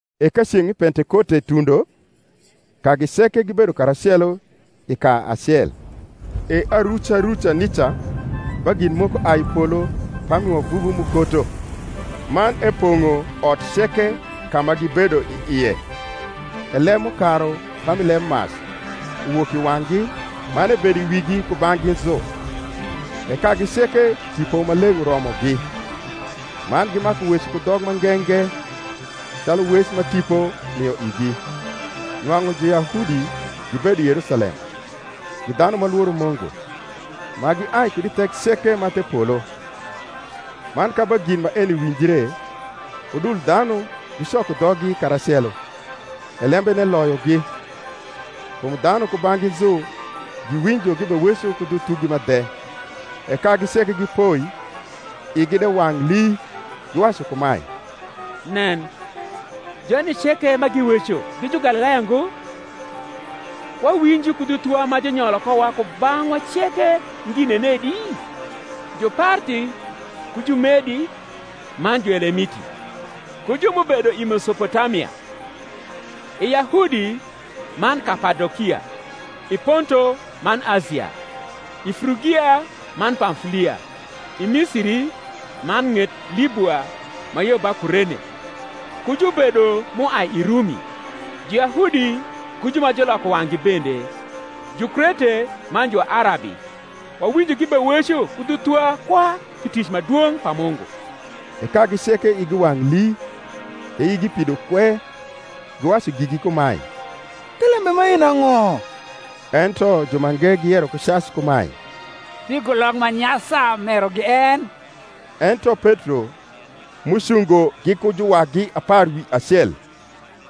E ka ceng’ mi Pentekote tundo, kagi ceke gibedo karacelo i ka acel. E aruca ruca nica ba gin moko ai i polo pami wavuvu m’ukoto, man epong’o ot ceke ka ma gibedo i ie. E leb m’ukaru pami lebmac, uwok i wang’gi; man ebedo i wigi kubang’gi nzu. E kagi ceke Tipo Maleng’ uromogi, man gimaku weco ku dhok ma nge nge, calu wec ma Tipo mio igi. Nwang’u Juyahudi gibedo Yerusalem, gi dhanu ma lworo Mungu, ma giai kud i thek ceke ma the polo. Man ka ba gin maeni winjre, udul dhanu gicoko dhoggi karacelo, e lembene loyogi, kum dhanu kubang’gi nzu giwinjo gibeweco ku dhu thugi ma dhe. E kagi ceke gipoi igi de wang’ lii, giwacu kumae, Nen, joni ceke ma giweco gi Jugalilaya ngo? Wawinjo ku dhu thuwa ma junyolo kowa kubang’wa ceke ngi nenedi? Juparthi ku Jumedi man Juelemiti, ku ju m’ubedo i Mesopotamia, i Yahudi man Kapadokia, i Ponto man Asia, i Frugia man Pamfulia, i Misiri man ng’et Libua ma yo ba Kurene, ku jubedo m’uai i Rumi, Juyahudi ku ju ma juloko wang’gi bende, Jukrete man ju Arabi, wawinjo gibeweco ku dhu thuwa kwa pi tic ma dwong’ pa Mungu. E kagi ceke igi wang’ lii, e igi pido kwe, giwacu gigi kumae, Thelembe maeni ang’o? Ento jumange giyero ku cac kumae, Pigulok ma nyasa merogi en. Ento Petro, m’ucungo giku juwagi apar wi acel,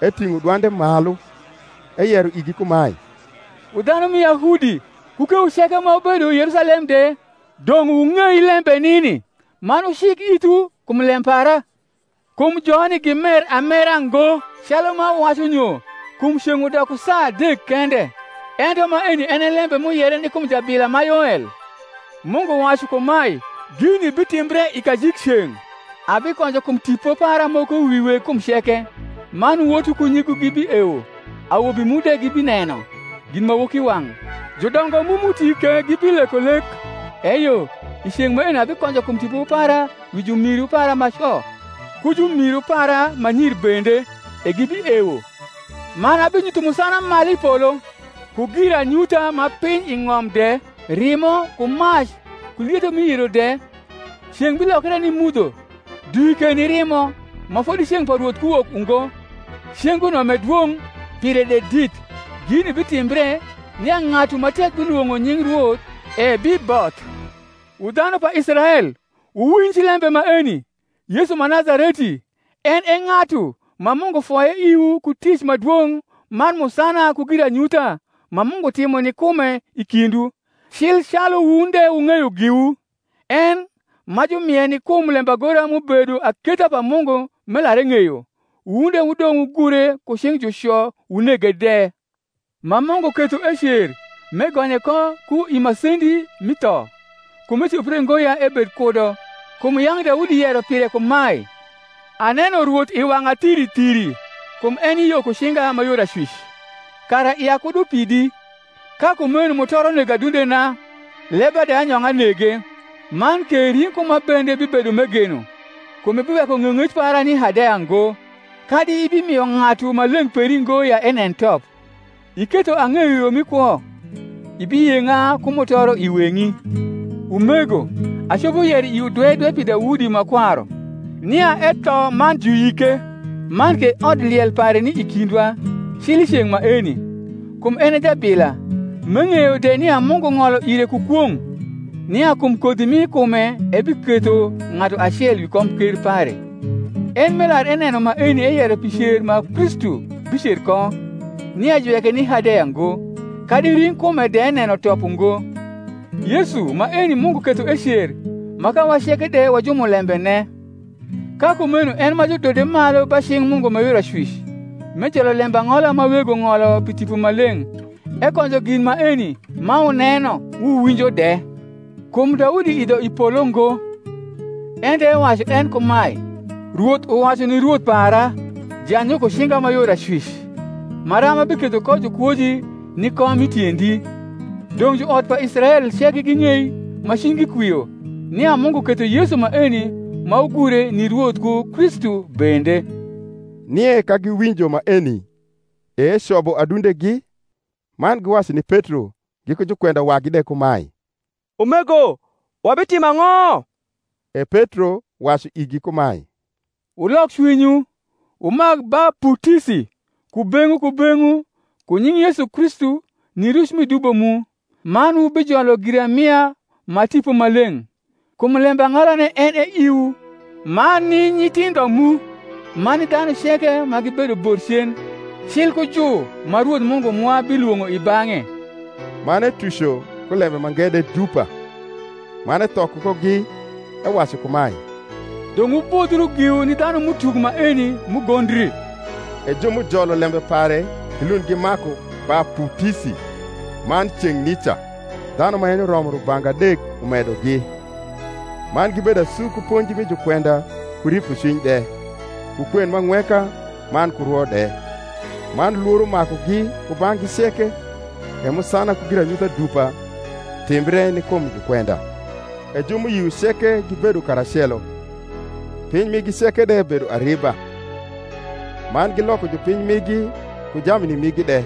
eting’o dwande malu, eyero igi kumae, Wu dhanu mi Yahudi, ku kewu ceke ma wubedo i Yerusalem de, dong’ wung’ei lembe nini, man wucik ithwu kum lem para. Kum joni gimer amera ngo, calu ma wuwacu nyo; kum ceng’ udoko saa adek kende; ento maeni en e lembe m’uyere ni kum jabila ma Yoel: Mungu wacu kumae, Gini bitimbre i kajik ceng’, Abikonjo kum Tipo para moko wi weg kum ceke: Man wotu ku nyigu gibiewo, Awobi mu de gibineno ginmawokiwang’, Judongo mu m’uti ke gibileko lek: Eyo i ceng’ maeno abikonjo kum Tipo para wi jumiru para ma co. Ku jumiru para ma nyir bende; e gibiewo. Man abinyutho musana malu i polo, Ku giranyutha ma piny i ng’om de; Rimo, ku mac, ku lietho mi yiro de: Ceng’ bilokre ni mudho, Dwi ke ni rimo, Ma fodi ceng’ pa Rwoth ku wok ungo, Cenguno m’e dwong’ pire de dit: Gini bitimbre, nia ng’atu ma tek bilwo ng’o nying Rwoth ebiboth. Wu dhanu pa Israel, wuwinj lembe maeni: Yesu ma Nazareti, en e ng’atu ma Mungu foye iwu ku tic ma dwong’ man musana ku giranyutha ma Mungu timo ni kume i kindwu, cil calu wun de wung’eyo giwu; en, ma jumie ni kum lembagora m’ubedo aketha pa Mungu m’elar eng’eyo, wun de wudong’ wugure ku cing’ juco wunege de: ma Mungu ketho ecer, m’egonye ko ku i masendi mi tho: kum ecopre ngo ya ebed kudo. Kum yang’ Daudi yero pire kumae, Aneno Rwoth i wang’a thiri thiri; Kum eni yo ku cinga ma yor acwic, kara ia kud upidi: Ka kumeno mutoro nego adundena, leba de anyong’a nege; Man ke ring’kuma bende bibedo m’egeno; Kum ibiweko ng’eyong’ec para ni Hadeya ngo, Kadi ibimio Ng’atu Maleng’ peri ngo ya enen top. Iketho ang’eyo yo mi kwo; Ibiyeng’a ku mutoro i weng’i. Umego, acopo yero iwu dwe dwe pi Daudi ma kwaru, nia etho man juyike, man ke odliel pare ni i kindwa cil i ceng’ maeni. Kum en e jabila, m’eng’eyo de nia Mungu ng’olo ire ku kwong’, nia kum kodhi mi kume ebiketho ng’atu acel wi komker pare: en m’elar eneno maeni eyero pi cer ma Kristu bicer ko, nia juweke ni Hadeya ngo, kadi ring’kume de neno top ungo. Yesu maeni Mungu ketho ecer, ma kawa ceke de wa jumniembene. Ka kumeno en ma judode malu ba cing’ Mungu ma yor acwic, m’ejolo lembang’ola ma Wego ng’olo pi Tipo Maleng’, ekonjo gin maeni, ma wuneno wuwinjo de. Kum Daudi idho i polo ngo: ento ewacu en kumae, Rwoth uwacu ni Rwoth para, Jany yo ku cinga ma yor acwic, Maram abiketho ko jukwoji ni kom mi tiendi. Dong’ juot pa Israel ceke ging’ei ma cwinygi kwio, nia Mungu ketho Yesu maeni ma wugure, ni Rwoth ku Kristu bende. Nie ka giwinjo maeni, e ecobo adundegi, man giwacu ni Petro giku jukwenda wagi de kumae, Umego, wabitimo ang’o? E Petro wacu igi kumae, Wulok cwinywu, wumak baputisi kubeng’wu kubeng’wu ku nying’ Yesu Kristu ni ruc mi dubo mu; man wubijolo giramia ma Tipo Maleng’. Kum lembang’olane en e iwu, man ni nyithindho mu, man ni dhanu ceke ma gibedo bor cen, cil ku ju ma Rwoth Mungu mwa bilwong’o i bang’e. Man etuco ku lembe mange de dupa, man ethokogi, ewacu kumae, Dong’ wubodhiu giwu ni dlianum’utuk maeni m’ugondri. E ju m’ujolo lembe pare gilund gimaku baputisi: man ceng’ nica dhanu ma yenyo romo rubanga adek umedogi. Man gibedo asu ku ponji mi jukwenda ku ripocwiny de, ku kwen m’angweka man ku rwo de. Man Iworo makugi kubang’gi ceke: e musana ku giranyutha dupa rimbre ni kum jukwenda. E ju m’uyio ceke gibedo karacelo, piny migi ceke de bedo ariba; man giloko jupiny migi ku jamni migi de,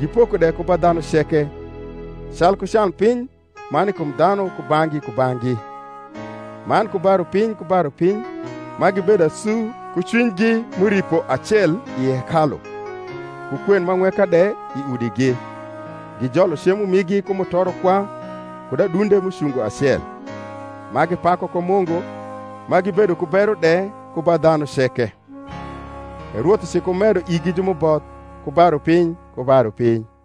gipoko de ku ba dhanu ceke, calku canpiny ma ni kum dhanu kubang’gi kubang’gi. Man ku ba rupiny ku ba rupiny, ma gibedo asu ku cwinygi m’uripo acel i hekalu, ku kwen m’ang’weka de i udigi, gijolo cemo migi ku mutoro kwa kud adunde m’ucungo acel, ma gipaku ko Mungu, ma gibedo ku bero de ku ba dhanu ceke. E Rwoth ucikumedo igi ju m’uboth ku ba rupiny ku ba rupiny.